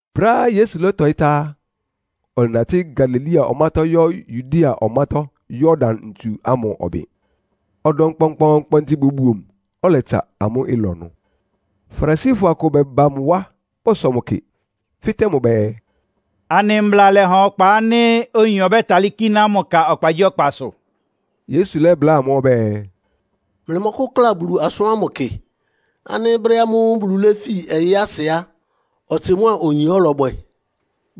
Brɛ́á Yesu lɔ́tɔɩ́ tá á, ɔlɛnatɩ́ Galilea ɔmátɔ́ yɔ́ Yudea ɔmátɔ́ Yordan ntsu ámʋ ɔbɩn. Ɔdɔm kpɔnkpɔɔnkpɔntɩ bobuo mʋ, ɔlɛtsa amʋ́ ɩlɔ ɩnʋ. Farisifɔ akʋ bɛba mʋ wá bɔsɔ mʋ kɩ, fɩ́tɛ́ mʋ bɛɛ, “Anɩ Mbla lɛ́ha ɔkpa ánɩ́ oyin ɔbɛ́talɩ́ kíná mʋ ka ɔkpagyíɔkpasʋ?” Yesu lɛ́bláa amʋ́ ɔbɛ́ɛ, “Mlɩmɔ́kʋ́kla Bulu asʋ́n ámʋ kɩ ánɩ́ brɛ́ ámʋ́ʋ́ Bulu léfi ɔyɩ́ asɩ á, ɔtsɩ mʋ́a oyin ɔ́lɔbwɛ?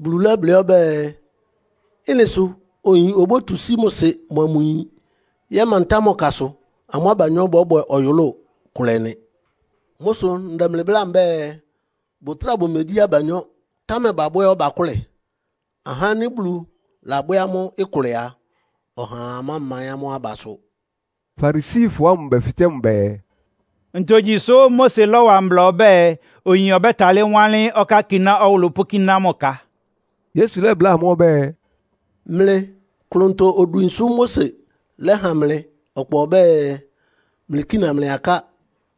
Bulu lɛ́blɩ́ ɔbɛ́ɛ, ‘Ɩ́nɩ sʋ oyin obótu sí mʋ sɩ mʋa mʋ yin yɛ́mantá mʋ kasʋ, amʋ́ abanyɔ́ bɔ́bwɛ ɔyʋlʋ́ʋ kʋlɛ nɩ.’ Mʋ́ sʋ ndɛ mlɩ bláa mbɛ́ɛ, bʋtráa bʋmegyí abanyɔ́, támɛ babwɛ́ ɔbakʋ́lɛ. Ahá ánɩ́ Bulu labwɛ́ amʋ́ ɩkʋlɛ a, ɔhaa mámaɩ́n amʋ́ abasʋ.” Farisifɔ ámʋ bɛfɩtɛ́ mʋ bɛɛ, “Ntogyi sʋ́ Mose lɔ́wa mbla ɔbɛ́ɛ, oyin ɔbɛ́talɩ́ wánlɩ́n ɔkákiná ɔwʋlʋ́ pʋ́kíná mʋ ka?” Yesu lɛ́bláa amʋ́ ɔbɛ́ɛ, “Mlɩ klʋntɔ odwin sʋ́ Mose lɛ́ha mlɩ ɔkpa ɔbɛ́ɛ, mlɩkína mlɩ aká,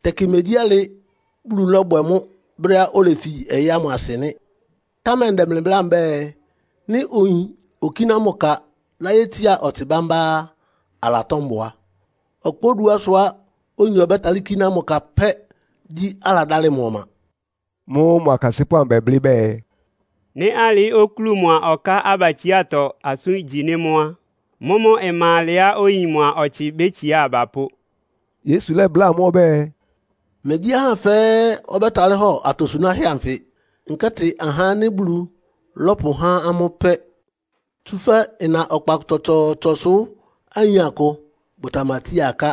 tɛkɩ megyí alɩ Bulu lɔ́bwɛ mʋ́ brɛ́á olefi ɔyɩ́ ámʋ asɩ nɩ́. Támɛ ndɛ mlɩ bláa mbɛ́ɛ, nɩ́ oyin okíná mʋ ka láyétsiá ɔtsɩ bámbá á, alatɔ́ mbʋa. Ɔkpa oduásʋ́á oyin ɔbɛ́talɩ́ kíná mʋ ka pɛ́ gyí aladálɩ mʋ ɔma.” Mʋ́ʋ́ mʋ akasɩ́pʋ́ amʋ bɛblɩ́ bɛɛ, “Nɩ́ alɩ okúlu mʋa ɔká abatsiátɔ asʋ́n igyi nɩ́ mʋ́ á, mʋ́mʋ́ ɩma alɛ́á oyin mʋa ɔtsɩ bétsiá aba pó.” Yesu lɛ́bláa amʋ́ ɔbɛ́ɛ, “Megyí ahá fɛ́ɛ́ ɔbɛ́talɩ́ hɔ atosunáhɛ́ anfɩ. Nkɛ́tɩ ahá ánɩ́ Bulu lɔ́pʋhá amʋ́ pɛ́. Tsúfɛ́ ɩna ɔkpa tsɔtsɔɔtsɔsʋ ayin akʋ bʋtamatsía aká.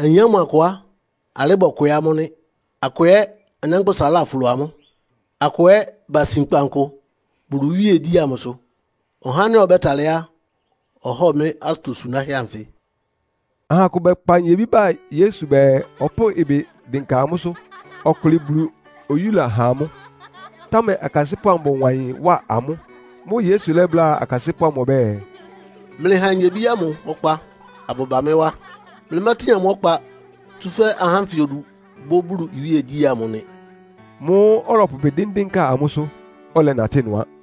Ayin ámʋ akʋ á, alɩ́ bɔkwɩɩ́ amʋ́ nɩ́. Akʋ ɛ́ anyánkpʋ́sa láflo amʋ́. Akʋ ɛ́ basin kpankʋ Bulu iwíegyí ámʋ sʋ. Ɔhá ánɩ́ ɔbɛ́talɩ́ á, ɔhɔ́ɔ mɩ́ atosunáhɛ́ anfɩ.” Aha akʋ bɛkpa nyebí ba Yesu bɛɛ, ɔpʋ́ʋ ɩbɩ dɩnka amʋ́sʋ́, ɔkʋlɩ Bulu oyúla ha amʋ́. Támɛ akasɩ́pʋ́ amʋ bɔwa ɩyɩn wá amʋ́. Mʋ́ʋ́ Yesu lɛ́bláa akasɩ́pʋ́ amʋ ɔbɛ́ɛ, “Mlɩha nyebí ámʋ ɔkpa abʋba mɩ́ wá. Mlɩmátin amʋ́ ɔkpa, tsúfɛ́ ahá ánfɩ odu bʋ́ Bulu iwíegyí ámʋ nɩ.” Mʋ́ʋ́ ɔlɔpʋ ɩbɩ dɩ́ndɩ́nka amʋ́sʋ́, ɔlɛnatɩ́ ɩnʋ á.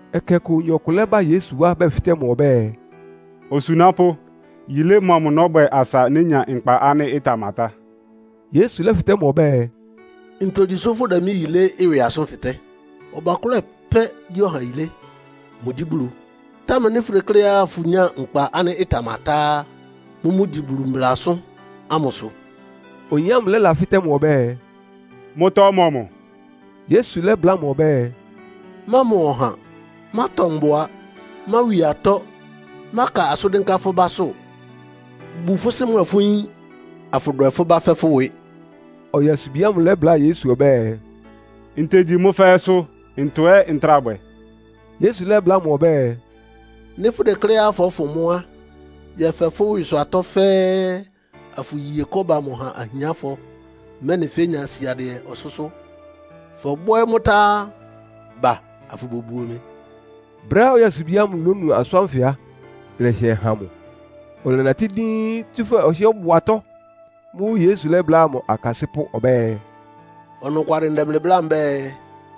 Ɛkɛ ɔkʋ oyin ɔkʋ lɛ́ba Yesu wá bɛfɩtɛ́ mʋ ɔbɛ́ɛ, “Osunápʋ́, yilé mɔmʋ nɔ́bwɛ asa nénya nkpa ánɩ́ ɩtamatá?” Yesu lɛ́fɩtɛ́ mʋ ɔbɛ́ɛ, “Ntogyi sʋ́ fʋdɛ mɩ́ yilé ɩwɩ asʋ́n fɩtɛ́? Ɔbakʋ́lɛ pɛ́ gyí ɔha yilé. Mʋgyí Bulu. Támɛ nɩ́ fʋdekléá fʋnyáa nkpa ánɩ́ ɩtamatá á, mʋ́mʋ́ gyi Bulu mbla asʋ́n ámʋsʋ.” Oyin ámʋ lɛ́lafɩ́tɛ́ mʋ ɔbɛ́ɛ, “Mʋ́tɔ́ mɔmʋ?” Yesu lɛ́bláa mʋ ɔbɛ́ɛ, “Mámɔ ɔha, mátɔ mbʋa, máwi atɔ́, máka asʋ́n dɩ́nká fʋ́ básʋ́. Bu fʋ́ sɩ́ mʋa fʋ́ yín, afʋdwɛ fʋ́ bá fɛ́ fʋ́ ɩwɩ.” Ɔyasubi ámʋ lɛ́bláa Yesu ɔbɛ́ɛ, “Ntegyi mʋ́ fɛ́ɛ́sʋ́. Ntɔ ɛ́ ntráa bwɛ?” Yesu lɛ́bláa mʋ ɔbɛ́ɛ, “Nɩ́ fʋdekléá fɔ́fʋn mʋ́ á, yɛfɛ fʋ́ ɩwɩsʋ atɔ́ fɛ́ɛ́, afʋye kɔ́ba amʋ ha ahiánfɔ, mɛ́nɩ fénya siadɩɛ ɔsʋ́sʋ́. Fɔbwɛ́ mʋ́ tá á, ba afʋbobuo mɩ.” Brɛ́á ɔyasubi ámʋ lónu asʋ́n ánfɩ á, ɩlɛhɩɛ́ han mʋ, ɔlɛnatɩ́ díín, tsúfɛ́ ɔhɩ́ɛ́ ɔbʋ atɔ́. Mʋ́ʋ́ Yesu lɛ́bláa mʋ akasɩ́pʋ́ ɔbɛ́ɛ, “Ɔnɔkwalɩ ndɛ mlɩ bláa mbɛ́ɛ,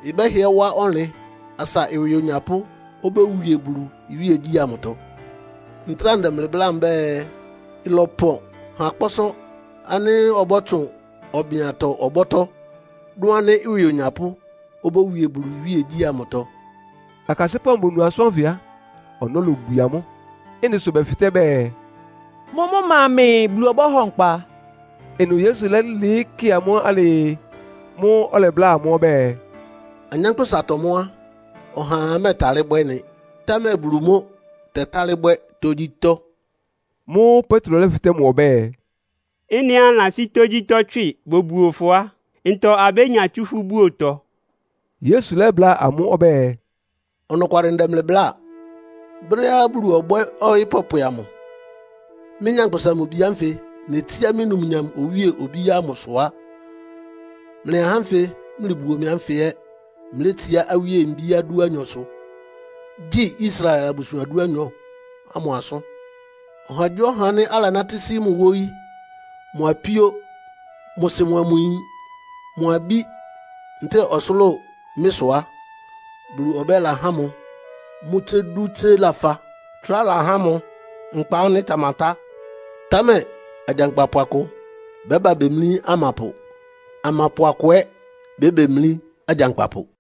ɩbɛ́hɩɛ wá ɔnlɩn asa ɩwɩ onyapʋ́ obówie Bulu iwíegyí ámʋtɔ. Ntráa ndɛ mlɩ bláa mbɛ́ɛ, ɩlɔpɔn ha kpɔ́sɔ́ ánɩ́ ɔbɔ́tsʋn ɔbɩn-atɔ ɔbɔ́tɔ́, dʋn ánɩ́ ɩwɩ onyapʋ́ obówie Bulu iwíegyí ámʋtɔ.” Akasɩ́pʋ́ amʋ bonu asʋ́n ánfɩ á, ɔnɔ́ lobwie amʋ́. Ɩ́nɩ sʋ bɛfɩtɛ́ bɛɛ, “Mʋ́mʋ́ ma mɛɛ Bulu ɔbɔ́hɔ nkpa?” Ɩnʋ Yesu lɛ́lɩɩ́ kɩ amʋ́ alɩɩ. Mʋ́ʋ́ ɔlɛbláa amʋ́ ɔbɛ́ɛ, “Anyánkpʋ́satɔ mʋ́ á, ɔhaa mɛ́ɛtalɩ́ bwɛ́ ɩ́nɩ, támɛ Bulu mʋ́ tɛtálɩ́ bwɛ́ tógyítɔ́.” Mʋ́ʋ́ Petro lɛ́fɩtɛ́ mʋ ɔbɛ́ɛ, “Ɩ́nɩá anɩlasí tógyítɔ́ tswɩ bobuo fʋ á, ntɔ abénya tsú fʋ́ búotɔ?” Yesu lɛ́bláa amʋ́ ɔbɛ́ɛ, “Ɔnɔkwalɩ ndɛ mlɩ bláa. Brɛ́á Bulu ɔbwɛ́ ɔyɩ́ pɔpwɛ amʋ, mɩ́, Nyankpʋsa-Mʋ-Bi ánfɩ netsíá mɩ́ numnyam owíe obíá ámʋsʋ á, mlɩ ahá ánfɩ mlɩbuo mɩ ánfɩ ɛ́ mlétsiá awíe mbíá dúanyɔsʋ, gyi Israel abusuan dúanyɔ ámʋ asʋ́n. Ɔhagyíɔha ánɩ́ alanátɩ́ sí mʋ wóyí, mʋ apíó, mʋ sɩ mʋa mʋ yin, mʋ abí ntɛ́ɛ ɔsʋlʋ́ʋ mɩ́ sʋ á, Bulu ɔbɛ́la há mʋ mʋ́ tsé dú tsé lafa, trá lahá mʋ nkpa ánɩ́ ɩtamatá. Támɛ agyankpapʋ akʋ bɛ́ba bemlí amapʋ, amapʋ amʋ akʋ ɛ́ bébemlí agyankpapʋ.”